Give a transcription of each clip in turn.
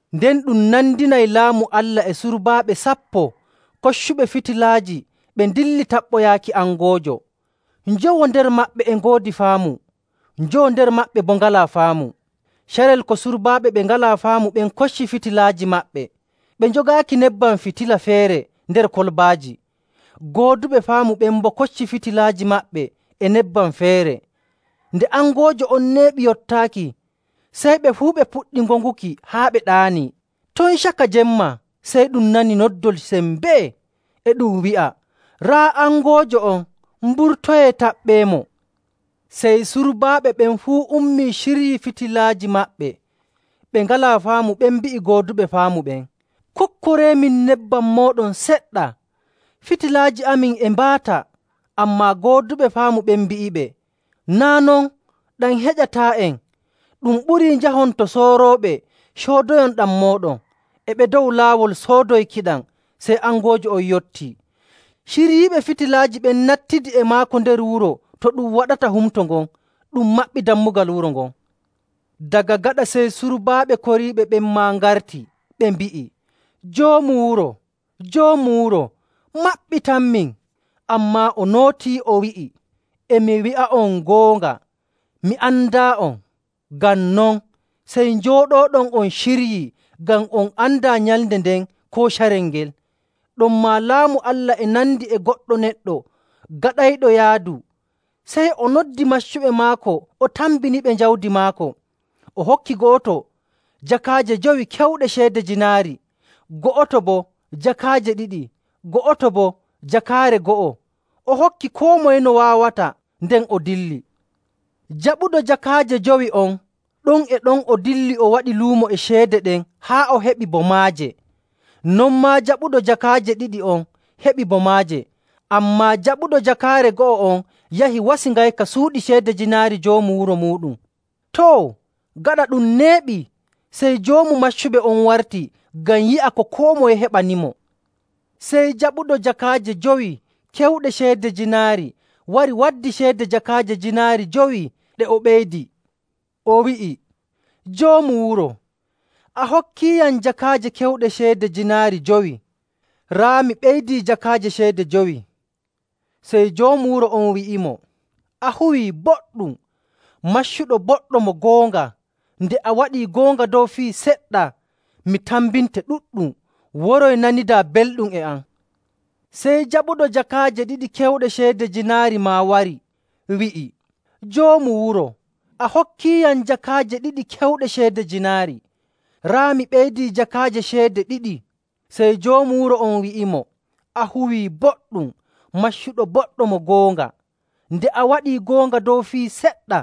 “Nden ɗum nandinay Laamu Allah e surbaaɓe sappo koccuɓe fitilaaji ɓe ndilli taɓɓoyaaki angoojo.. Njowo nder maɓɓe e ngoodi faamu, njowo nder maɓɓe boo ngalaa faamu. Carel ko surbaaɓe ɓe ngalaa faamu ɓen kocci fitilaaji maɓɓe, ɓe njogaaki nebbam fitila feere nder kolbaaji. Gooduɓe faamu ɓen boo kocci fitilaaji maɓɓe e nebbam feere. Nde angoojo on neeɓi yottaaki, sey ɓe fuu ɓe puɗɗi ŋoŋuki haa ɓe ɗaani. “Ton caka jemma sey ɗum nani noddol sembee, e ɗum wi'a, ‘Raa angoojo on! Mburtoyee, taɓɓeemo!’ Sey surbaaɓe ɓen fuu ummii ciryii fitilaaji maɓɓe. Ɓe ngalaa faamu ɓen mbi'i gooduɓe faamu ɓen, ‘Kokkoreemin nebbam mooɗon seɗɗa. Fitilaaji amin e mbaata!’ Ammaa gooduɓe faamu ɓen mbi'iɓe, ‘Naa' non, ɗam heƴataa'en. Ɗum ɓurii njahon to soorooɓe, coodoyon ɗam mooɗon.’ E ɓe dow laawol soodoykiɗam, sey angoojo on yottii. Ciryiiɓe fitilaaji ɓen nattidi e maako nder wuro to ɗum waɗata humto ngon. Ɗum maɓɓii dammugal wuro ngon. “Daga gaɗa sey surbaaɓe koriiɓe ɓen maa ngarti, ɓe mbi'i, ‘Joomu wuro! Joomu wuro! Maɓɓitanmin!’ Ammaa o nootii, o wi'i, ‘E mi wi'a'on goonga, mi andaa'on.’. “Ngam non, sey njooɗooɗon on ciryii, ngam on andaa nyalnde nden koo carel ngel. “Ɗonmaa, Laamu Allah e nandi e goɗɗo neɗɗo gaɗayɗo yaadu, sey o noddi maccuɓe maako o tambiniɓe jawdi maako. O hokki go'oto jakaaje jowi kewɗe ceede jiinaari, go'oto boo jakaaje ɗiɗi, go'oto boo jakaare go'o. O hokki koo moye no waawata, nden o dilli. Jaɓuɗo jakaaje jowi on, ɗon e ɗon o dilli o waadi luumo e ceede ɗen haa o heɓi bo maaje. Non maa jaɓuɗo jakaaje ɗiɗi on heɓi bo maaje. Ammaa jaɓuɗo jakaare go'o on yahi wasi ngayka suuɗi ceede jiinaari joomu wuro muuɗum. “Too, gaɗa ɗum neeɓii, sey joomu maccuɓe on warti ngam yi'a ko koo moye heɓanimo. Sey jaɓuɗo jakaaje jowi kewɗe ceede jiinaari wari waddi ceede jakaaje jiinaari jowi ɗe o ɓeydii. O wi'i, ‘Joomu wuro, a hokkiiyam jakaaje kewɗe ceede jiinaari jowi. Raa mi ɓeydii jakaaje ceede jowi.’ Sey joomu wuro on wi'imo, ‘A huwii boɗɗum, maccuɗo boɗɗo mo goonga. Nde a waɗii goonga dow fii seɗɗa, mi tambinte ɗuɗɗum. Woroy, nanidaa belɗum e am.’ Sey jaɓuɗo jakaaje ɗiɗi kewɗe ceede jiinaari maa wari, wi'i, ‘Joomu wuro, a hokkiiyam jakaaje ɗiɗi kewɗe ceede jiinaari. Raa mi ɓeydii jakaaje ceede ɗiɗi.’ Sey joomu wuro on wi'imo, ‘A huwii boɗɗum, maccuɗo boɗɗo mo goonga. Nde a waɗii goonga dow fii seɗɗa.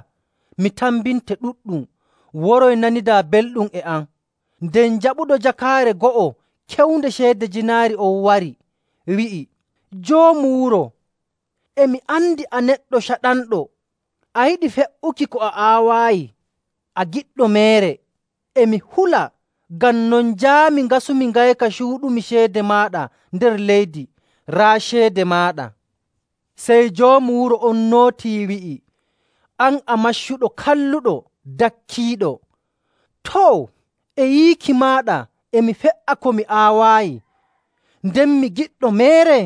Mi tambinte ɗuɗɗum. Woroy, nanidaa belɗum e am.’ Nden jaɓuɗo jakaare go'o kewnde ceede jiinaari on wari, wi'i, ‘Joomu wuro, e mi andi a neɗɗo caɗanɗo, a yiɗi fe''uki ko a aawaayi, a giɗɗo meere. E mi hula, ngam non njaami ngasumi ngayka cuuɗumi ceede maaɗa nder leydi. Raa ceede maaɗa!’ Sey Joomu wuro on nootii, wi'i, ‘An a maccuɗo kalluɗo, dakkiiɗo! Too, e yiiki maaɗa e mi fe''a ko mi aawaayi, nden mi giɗɗo meere?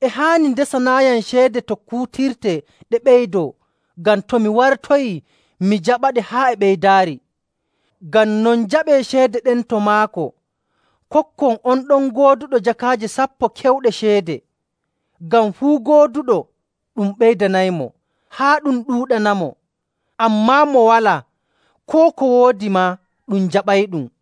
E haani ndesanaayam ceede to ɗe kuutirtee ɗe ɓeydoo, ngam to mi wartoyii mi jaɓaɗe haa e ɓeydaari! Ngam non, njaɓee ceede ɗen to maako, kokkon on ɗon gooduɗo jakaaje sappo kewɗe ceede. Ngam fuu gooduɗo, ɗum ɓeydanaymo, haa ɗum ɗuuɗanamo. Ammaa mo walaa, koo ko o woodi maa ɗum jaɓayɗum..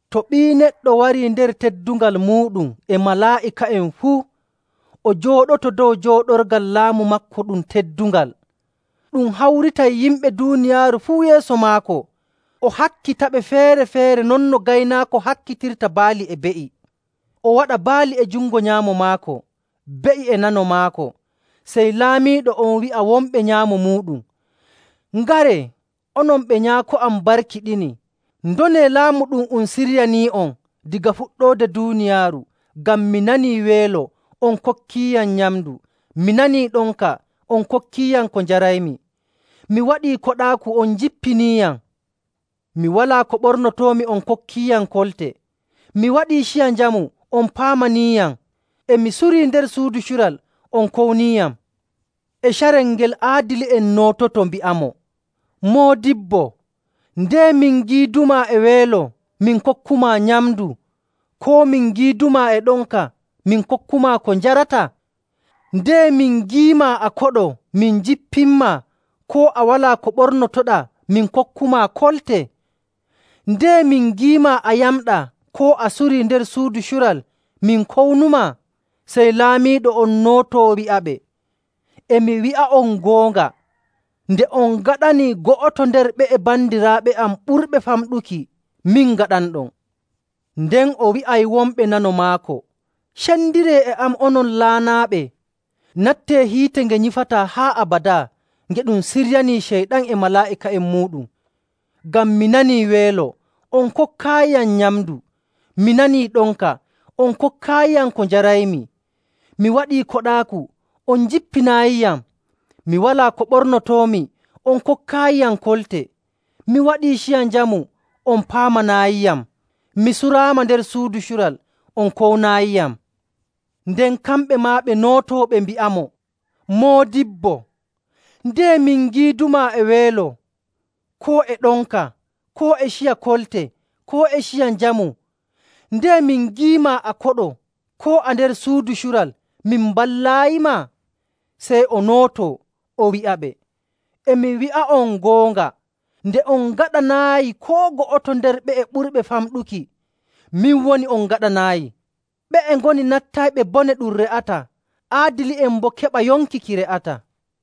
“To Ɓii Neɗɗo warii nder teddungal muuɗum e malaa'ika'en fuu, o jooɗoto dow jooɗorgal laamu maako ɗum teddungal.. Ɗum hawritay yimɓe duuniyaaru fuu yeeso maako, o hakkitaɓe feere‑feere non no gaynaako hakkitirta baali e be'i. O waɗa baali e jungo nyaamo maako, be'i e nano maako. Sey Laamiiɗo on wi'a wonɓe nyaamo muuɗum, ‘Ngaree, onon ɓe Nyaako am barkiɗini, ndonee Laamu ɗum um siryanii'on daga fuɗɗoode duuniyaaru. Ngam mi nanii weelo on kokkiiyam nyamndu. Mi nanii ɗonka on kokkiiyam ko njaraymi. Mi waɗii koɗaaku on njippiniiyam. Mi walaa ko ɓornotoomi on kokkiiyam kolte. Mi waɗii ciya njamu on paamaniiyam. E mi suri nder suudu cural on kowniiyam.’ E carel ngel aadili'en noototo, mbi'amo, ‘Moodibbo, ndeye min ngiidumaa e weelo min kokkumaa nyamndu, koo min ngiidumaa e ɗonka min kokkumaa ko njarataa? Ndeye min ngiimaa a koɗo min njippinmaa, koo a walaa ko ɓornotoɗaa min kokkumaa kolte? Ndeye min ngiimaa a yamɗaa koo a surii nder suudu cural min kownumaa?’ Sey Laamiiɗo on nootoo, wi'aɓe, ‘E mi wi'a'on goonga, nde on ngaɗani go'oto nder ɓe'e bandiraaɓe am ɓurɓe famɗuki, min ngaɗanɗon.’ “Nden o wi'ay wonɓe nano maako, ‘Cendiree e am, onon laanaaɓe! Nattee hiite nge nyifataa haa abadaa nge ɗum siryanii Ceyɗan e malaa'ika'en muuɗum! Ngam mi nanii weelo on kokkaayiyam nyamndu. Mi nanii ɗonka on kokkaayiyam ko njaraymi. Mi waɗii koɗaaku on njippinaayiyam. Mi walaa ko ɓornotoomi on kokkaayiyam kolte. Mi waɗii ciya njamu on paamanaayiyam. Mi suraama nder suudu cural on kownaayiyam.’ Nden kamɓe maa ɓe nootoo, ɓe mbi'amo, ‘Moodibbo, ndeye min ngiidumaa e weelo, koo e ɗonka, koo e ciya kolte, koo e ciya njamu, ndeye min ngiimaa a koɗo, koo a nder suudu cural, min mballaayima?’ Sey o nootoo, o wi'aɓe, ‘E mi wi'a'on goonga, nde on ngaɗanaayi koo go'oto nder ɓe'e ɓurɓe famɗuki, min woni on ngaɗanaayi.’ Ɓe'e ngoni nattayɓe bone ɗum re'ataa, aadili'en boo keɓa yonki ki re'ataa.”.